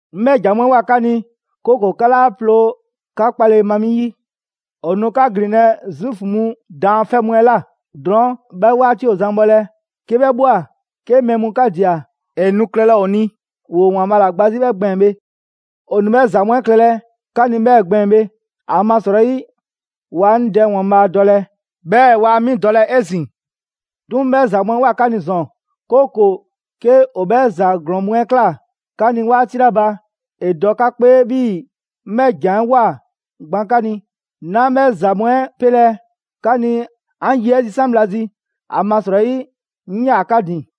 «'Ŋ 'bhɛ ‑jan mu 'ɛ ꞊woa 'ka ni, 'kooko‑ 'ka 'laa ploo 'ka 'kpale‑ ma 'mi 'yi. ‑O nu 'ka ‑gbinlɛ' Zuufu mu daanfɛ' mu 'ɛ ꞊la. Drɔɔn', 'bhɛ 'waati ‑o zan bhɔlɛ, 'ke 'bhɛ ꞊bhwa, 'ke mɛɛ mu 'ka ꞊dia, ‑e nu klɛlɛ ‑o ni 'bhii‑ ‑woo ‑Waanbhaa' ‑la gba 'zi 'bhɛɛ‑ gbɛɛn‑ bhe. ‑O nu 'bhɛ ‑za mu 'ɛ klɛlɛ 'ka ni 'bhɛ gbɛɛn‑ bhe, ‑amasrɔyi waa 'ŋ Dɛ ‑Waanbhaa' dɔlɛ, 'bhɛɛ‑ waa 'mi dɔlɛ 'ezin‑. 'Duŋ‑, 'ŋ 'bhɛ ‑za mu 'ɛ ꞊woa 'ka ni ‑zɔn, 'kooko‑ 'ke ‑o 'bhɛ ‑za ‑glɔɔn mu 'ɛ ꞊kla 'ka ni 'waati 'la ba, ‑e dɔ 'ka 'kpee 'bhii‑ 'ŋ 'bhɛ ‑jan 'ɛ ꞊woa gban 'ka ni. 'Naa 'bhɛ ‑za mu 'ɛ 'pelɛ‑ 'ka ni 'an ye 'ɛ zisan' bhla zi, ‑amasrɔyi 'ŋ 'yaa‑ 'ka ‑din.»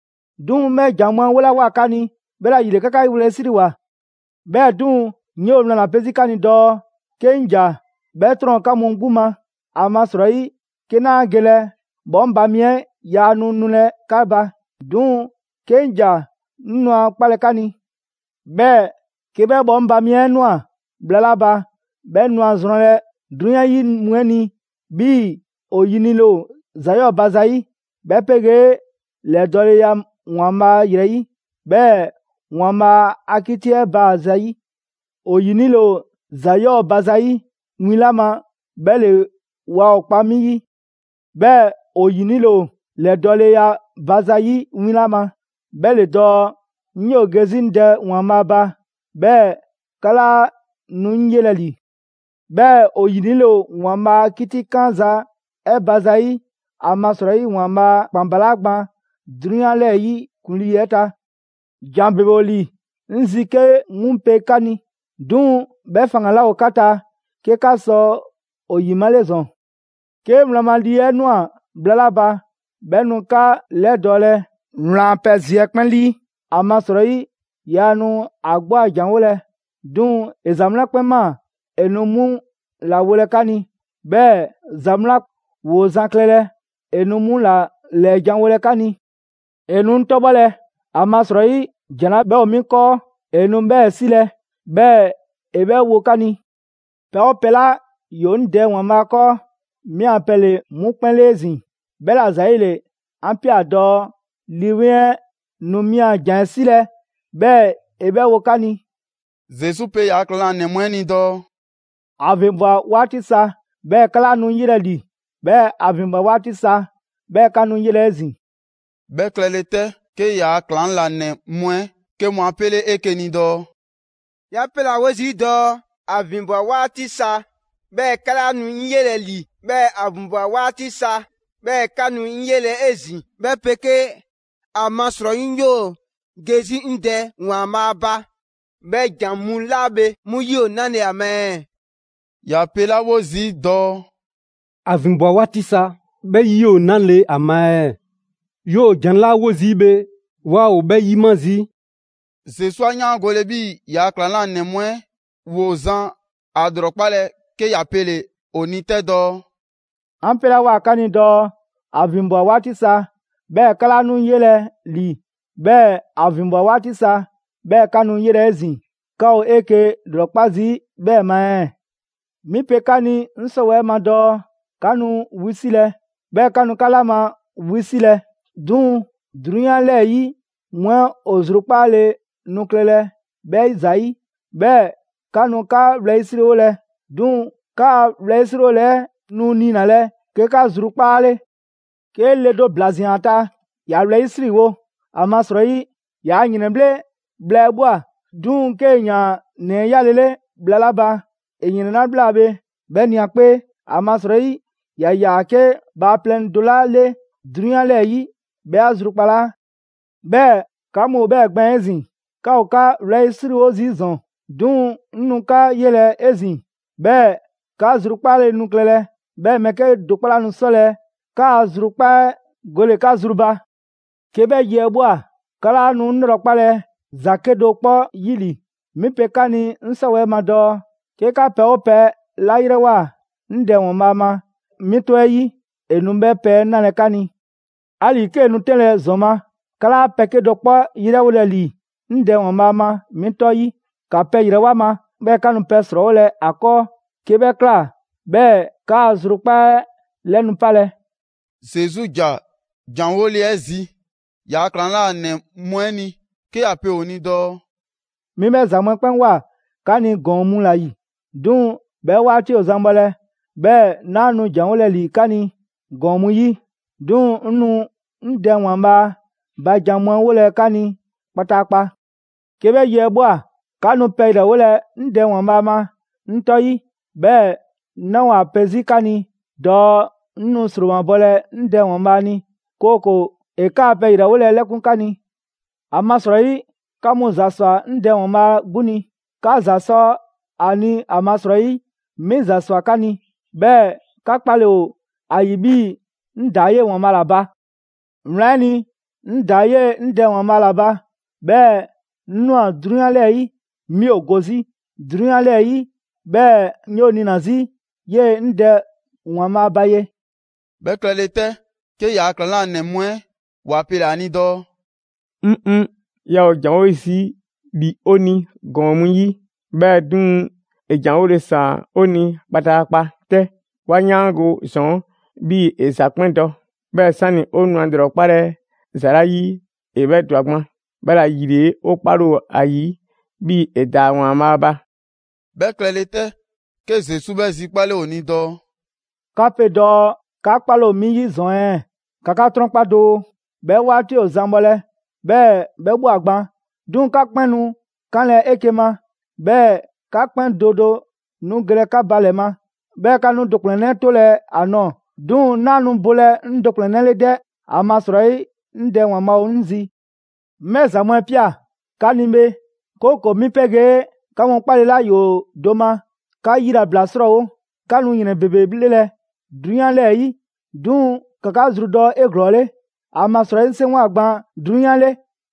'Duŋ‑ 'ŋ 'bhɛ ‑jan mu 'ɛ 'wolawoa 'ka ni, 'bhɛla‑ ‑yile 'ka 'ka wlɛyisriwoa. 'Bhɛɛ‑ 'duŋ‑, 'ŋ 'yoo‑ wlan ‑la pe 'zi 'ka ni dɔɔ: 'ke 'ŋ ‑ja, 'bhɛ 'trɔn‑ ‑o 'ka mu 'gbu ma. ‑Amasrɔyi 'ke 'naa gelɛ, 'Bhɔŋba‑ mi 'ɛ yaa nu nulɛ 'ka ba. 'Duŋ‑ 'ke 'ŋ ‑ja, 'ŋ nu ‑a 'kpalɛ‑ 'ka ni. 'Bhɛɛ‑ 'ke 'bhɛ 'Bhɔŋba‑ mi 'ɛ ꞊nwa bhla 'la ba, 'bhɛ nu a zrɔnlɛ 'drunyan 'yi mu 'ɛ ni 'bhii‑ ‑o ‑yinile ‑o ‑za 'yɔɔ‑ ba zayi', 'bhɛ 'pegee ‑lɛdɔɔleya ‑Waanbhaa' ‑yrɛ 'yi, 'bhɛɛ‑ ‑Waanbhaa' a 'kiti 'ɛ ba zayi'. ‑O ‑yinile ‑o ‑za 'yɔɔ ba zayi' win 'la ma, 'bhɛ ‑le waa ‑o 'kpa 'mi 'yi. 'Bhɛɛ‑ ‑o ‑yinile ‑o ‑lɛdɔɔleya ba zayi' win 'la ma, 'bhɛ ‑le dɔɔ 'ŋ 'yoo‑ ge 'zi 'ŋ Dɛ ‑Waanbhaa' ba, 'bhɛɛ‑ 'ka 'laa nu 'ŋ 'yelɛ‑ ‑li. 'Bhɛɛ‑ ‑o ‑yinile ‑o ‑Waanbhaa' a 'kitikanza 'ɛ ba zayi', ‑amasrɔyi ‑Waanbhaa' ‑kpan balaa' gban 'drunyan 'lɛɛ‑ 'yi ‑kuŋlii 'ɛ ta. «‑Jan ‑bebe ‑o ‑li 'ŋ zi 'ke 'mu pe 'ka ni, 'duŋ‑ 'bhɛ faŋgan‑ 'laa ‑o 'ka ta 'ke 'ka sɔ ‑o ‑yimale ‑zɔn. 'Ke wlan ma Lii 'Weŋ 'ɛ ꞊nwa bhla 'la ba, 'bhɛ nu 'ka 'lɛdɔɔlɛ wlan a pɛ zi 'ɛ 'kpɛn 'lii. ‑Amasrɔyi, Yaa nu ‑a 'gbu a janwolɛ, 'duŋ‑ ‑e ‑za mu 'la 'kpɛn ꞊maa ‑e nu 'mu ‑la wolɛ 'ka ni; 'bhɛɛ‑ ‑za mu 'la ‑woo zan klɛlɛ, ‑e nu 'mu ‑la ‑lɛɛjanwolɛ 'ka ni. ‑E nu 'ŋ 'tɔbhɔlɛ, ‑amasrɔyi ‑jan 'la 'bhɛ ‑o 'mi 'kɔɔ, ‑e nu 'bhɛɛ‑ 'silɛ‑, 'bhɛɛ‑ ‑e 'bhɛ wo 'ka ni. Pɛ 'oo pɛ 'la ‑yoo 'ŋ Dɛ ‑Waanbhaa' 'kɔɔ, 'mi a pɛ ‑le 'mu 'kpɛn 'le 'ezin‑. 'Bhɛla‑ ‑zayile 'an ꞊pia dɔɔ Lii 'Weŋ 'ɛ nu 'mi a ‑jan 'ɛ 'silɛ‑ 'bhɛɛ‑ ‑e 'bhɛ wo 'ka ni.» Zesu pe ‑yaa' ‑klaŋlanɛ mu 'ɛ ni dɔɔ: «‑A ‑vinbwa 'waati sa, 'bhɛɛ‑ 'ka 'laa nu 'ŋ 'yelɛ‑ ‑li, 'bhɛɛ‑ ‑a ‑vinbwa 'waati sa 'bhɛɛ‑ 'ka nu 'ŋ 'yelɛ‑ 'ezin‑.» 'Bhɛ klɛle 'tɛ, 'ke ‑yaa' ‑klaŋlanɛ mu 'ɛ 'ke mu 'a 'pele 'eke‑ ni dɔɔ: «‑Ya 'pelawo zii' dɔɔ: ‹‑A ‑vinbwa 'waati sa, 'bhɛɛ‑ 'ka 'laa nu 'ŋ 'yelɛ‑ ‑li, 'bhɛɛ‑ ‑a ‑vinbwa 'waati sa 'bhɛɛ‑ 'ka nu 'ŋ 'yelɛ‑ 'ezin‑›. 'Bhɛ 'pegee: ‹‑Amasrɔyi 'ŋ 'yoo‑ ge 'zi 'ŋ Dɛ ‑Waanbhaa' ba.› 'Bhɛ ‑jan mu 'la bhe 'mu 'yi ‑o 'nale‑ ‑a ma ɛɛ? ‑Ya 'pelawo zii' dɔɔ: ‹‑A ‑vinbwa 'waati sa›. 'Bhɛ 'yi ‑o 'nale‑ ‑a ma ɛɛ? ‑Yoo ‑jan 'la 'wo 'zi bhe, 'waa ‑o 'bhɛ 'yima zii'.» Zesu 'a 'yaangole 'bhii‑ ‑yaa' ‑klaŋlanɛ mu 'ɛ ‑woo zan ‑a ‑lrɔkpalɛ, 'ke ‑ya pele‑ ‑o ni 'tɛ dɔɔ: «'An 'pelawoa 'ka ni dɔɔ: ‹‑A ‑vinbwa 'waati sa, 'bhɛɛ‑ 'ka 'laa nu 'ŋ 'yelɛ‑ ‑li, 'bhɛɛ‑ ‑a ‑vinbwa 'waati sa 'bhɛɛ‑ 'ka nu 'ŋ 'ye 'ezin‑›. 'Ka ‑o 'eke‑ ‑lrɔkpa' zii' 'bhɛɛ‑ ma ɛɛ? 'Mi pe 'ka ni 'ŋ 'sɔwɛɛ‑ ma dɔɔ: 'ka nu wisilɛ, 'bhɛɛ‑ 'ka nu 'ka 'la ma wisilɛ, 'duŋ‑ 'drunyan 'lɛɛ‑ 'yi mu 'ɛ ‑o zrukpaale nu klɛlɛ 'bhɛ ‑zayi'. 'Bhɛɛ‑ 'ka nu 'ka wlɛyisriwolɛ, 'duŋ‑ 'kaa‑ wlɛyisriwole 'ɛ nu niinalɛ 'ke 'ka zrukpaa' 'le. 'Ke le do ‑bla ꞊zian ‑a ta, ‑ya wlɛyisriwo, ‑amasrɔyi yaa ‑yrɛnbhle' bhla 'ɛ ꞊bhwa. 'Duŋ‑ 'kee‑ ‑yaan ‑nɛ 'ɛ 'yalele bhla 'la ba, ‑e ‑yrɛn 'la ꞊bhla bhe, 'bhɛ ꞊nia ‑a 'kpee, ‑amasrɔyi ‑ya ‑yaa 'ke bhaaplɛŋ do 'la 'le 'drunyan 'lɛɛ‑ 'yi 'bhɛ 'a zrukpalaa. 'Bhɛɛ‑ 'ka mu ‑o 'bhɛɛ‑ gbɛɛn‑ 'ezin‑: 'ka ‑o 'ka wlɛyisriwo zii' ‑zɔn. 'Duŋ‑ 'ŋ nu 'ka 'yelɛ‑ 'ezin‑, 'bhɛɛ‑ 'ka zrukpaale nu klɛlɛ. 'Bhɛɛ‑ mɛɛ 'kedo‑ 'kpɔ 'laa nu 'sɔlɛ‑ 'kaa‑ zrukpaa 'ɛ gole‑ 'ka zru ba.» «'Ke 'bhɛ yi 'ɛ ꞊bhwa, 'ka 'laa nu 'ŋ 'lrɔkpalɛ ‑za 'kedo‑ 'kpɔ 'yi ‑li. 'Mi pe 'ka ni 'ŋ 'sɔwɛɛ‑ ma dɔɔ: 'ke 'ka pɛ 'oo pɛ 'la 'yrɛwoa‑ 'ŋ Dɛ ‑Waanbhaa' ma 'mi 'tɔ 'ɛ 'yi, ‑e nu 'bhɛ pɛ 'ɛ 'nalɛ‑ 'ka ni. 'Ali‑ 'kee‑ nu 'tɛnlɛ‑ ‑zɔn ma, 'ka 'laa pɛ 'kedo‑ 'kpɔ 'yrɛwolɛ ‑li 'ŋ Dɛ ‑Waanbhaa' ma 'mi 'tɔ 'yi. ‑Ka pɛ ‑yrɛwo' ‑a ma, 'bhɛɛ‑ 'ka nu pɛ 'srɔɔwolɛ ‑a 'kɔɔ. 'Ke 'bhɛ ꞊kla, 'bhɛɛ‑ 'kaa‑ zrukpaa' 'ɛ 'lɛ nu 'palɛ‑.» Zesu ‑ja ‑janwole 'ɛ zi ‑yaa' ‑klaŋlanɛ mu 'ɛ ni 'ke ‑ya pe ‑o ni dɔɔ: «'Mi 'bhɛ ‑za mu 'ɛ 'kpɛn ꞊woa 'ka ni ‑gɔɔn mu ‑la ‑yi. 'Duŋ‑ 'bhɛ 'waati ‑o zan bhɔlɛ, 'bhɛɛ‑ 'naa nu ‑janwolɛ ‑li 'ka ni ‑gɔɔn mu 'yi, 'duŋ‑ 'ŋ nu 'ŋ Dɛ ‑Waanbhaa' ba jan mu 'ɛ 'wolɛ‑ 'ka ni kpataakpa. 'Ke 'bhɛ yi 'ɛ ꞊bhwa, 'ka nu pɛ ‑yrɛwolɛ 'ŋ Dɛ ‑Waanbhaa' ma 'ŋ 'tɔ 'yi; 'bhɛɛ‑ 'naa‑ ‑o ‑a pe 'zi 'ka ni dɔɔ 'ŋ nu ‑sromabɔlɛ 'ŋ Dɛ ‑Waanbhaa' ni, 'kooko‑ ‑e 'kaa pɛ ‑yrɛwole 'ɛ 'lɛkun‑ 'ka ni. ‑Amasrɔyi 'ka mu ‑za sɔ 'ŋ Dɛ ‑Waanbhaa' 'gbu ni. 'Ka ‑za sɔ ‑a ni ‑amasrɔyi 'mi ‑za ‑swa 'ka ni, 'bhɛɛ‑ 'ka 'kpale‑ ‑o ‑a ‑yi 'bhii‑ 'ŋ ‑daa 'yee‑ ‑Waanbhaa' ‑la ba. Wlan 'ɛ ni, 'ŋ ‑daa 'yee‑ 'ŋ Dɛ ‑Waanbhaa' ‑la ba, 'bhɛɛ‑ 'ŋ ꞊nwa 'drunyan 'lɛɛ‑ 'yi. 'Mi ‑o go 'zi 'drunyan 'lɛɛ‑ 'yi, 'bhɛɛ‑ 'ŋ 'yoo‑ 'niina‑ 'zi 'yee‑ 'ŋ Dɛ ‑Waanbhaa' ba ye.» 'Bhɛ klɛle 'tɛ, 'ke ‑yaa' ‑klaŋlanɛ mu 'ɛ ‑wa pele‑ ‑a ni dɔɔ: «‑Ŋŋ'! 'Yaa ‑o ‑janwo' zii' ‑li 'o ni ‑gɔɔn mu 'yi, 'bhɛɛ‑ 'duŋ‑ 'e ‑janwole ‑saan 'o ni kpataakpa 'tɛ. 'Wa 'yaango‑ ‑zɔn 'bhii‑ 'e ‑za 'kpɛn dɔ. 'Bhɛɛ‑ 'sani‑ ‑o nu 'e 'lrɔkpalɛ ‑za 'la 'yi, 'e 'bhɛ ‑dwa gban. 'Bhɛla‑ ‑yile 'o 'kpale‑ ‑o ‑a ‑yi 'bhii‑ 'e ‑daa ‑Waanbhaa' ba.» 'Bhɛ klɛle 'tɛ, 'ke Zesu 'bhɛ zikpale ‑o ni dɔɔ: «'Ka pe dɔɔ 'ka 'kpale‑ ‑o 'mi 'yi ‑zɔn ɛɛ? ‑Ka 'ka 'trɔnkpa doo! 'Bhɛ 'waati ‑o zan bhɔlɛ, 'bhɛɛ‑ 'bhɛ ꞊bhwa gban 'duŋ‑, 'ka 'kpɛn nu 'kanlɛ‑ 'eke‑ ma, 'bhɛɛ‑ 'ka 'kpɛn do do nu gelɛ 'ka ba ‑lɛ ma, 'bhɛɛ‑ 'ka nu 'ŋ do ‑kplɛnnɛ' 'tolɛ‑ ‑a nɔɔ‑. 'Duŋ‑ 'naa nu bolɛ ‑o 'ŋ do ‑kplɛnnɛ' 'le 'dɛ, ‑amasrɔyi, 'ŋ Dɛ ‑Waanbhaa' ‑o 'ŋ zi. 'Ŋ 'bhɛ ‑za mu 'ɛ ꞊pia 'ka ni bhe, 'kooko‑ 'mi 'pegee 'ka mu 'kpale‑ 'la ‑yoo do ma, 'ka yilabla 'srɔɔwo‑. 'Ka nu ‑yrɛn ‑bebe 'bhlelɛ‑ 'drunyan 'lɛɛ‑ 'yi. 'Duŋ‑ ‑ka 'ka zrudɔ 'eglɔɔle! ‑Amasrɔyi 'ŋ 'seŋgwa‑ gban 'drunyan 'le.»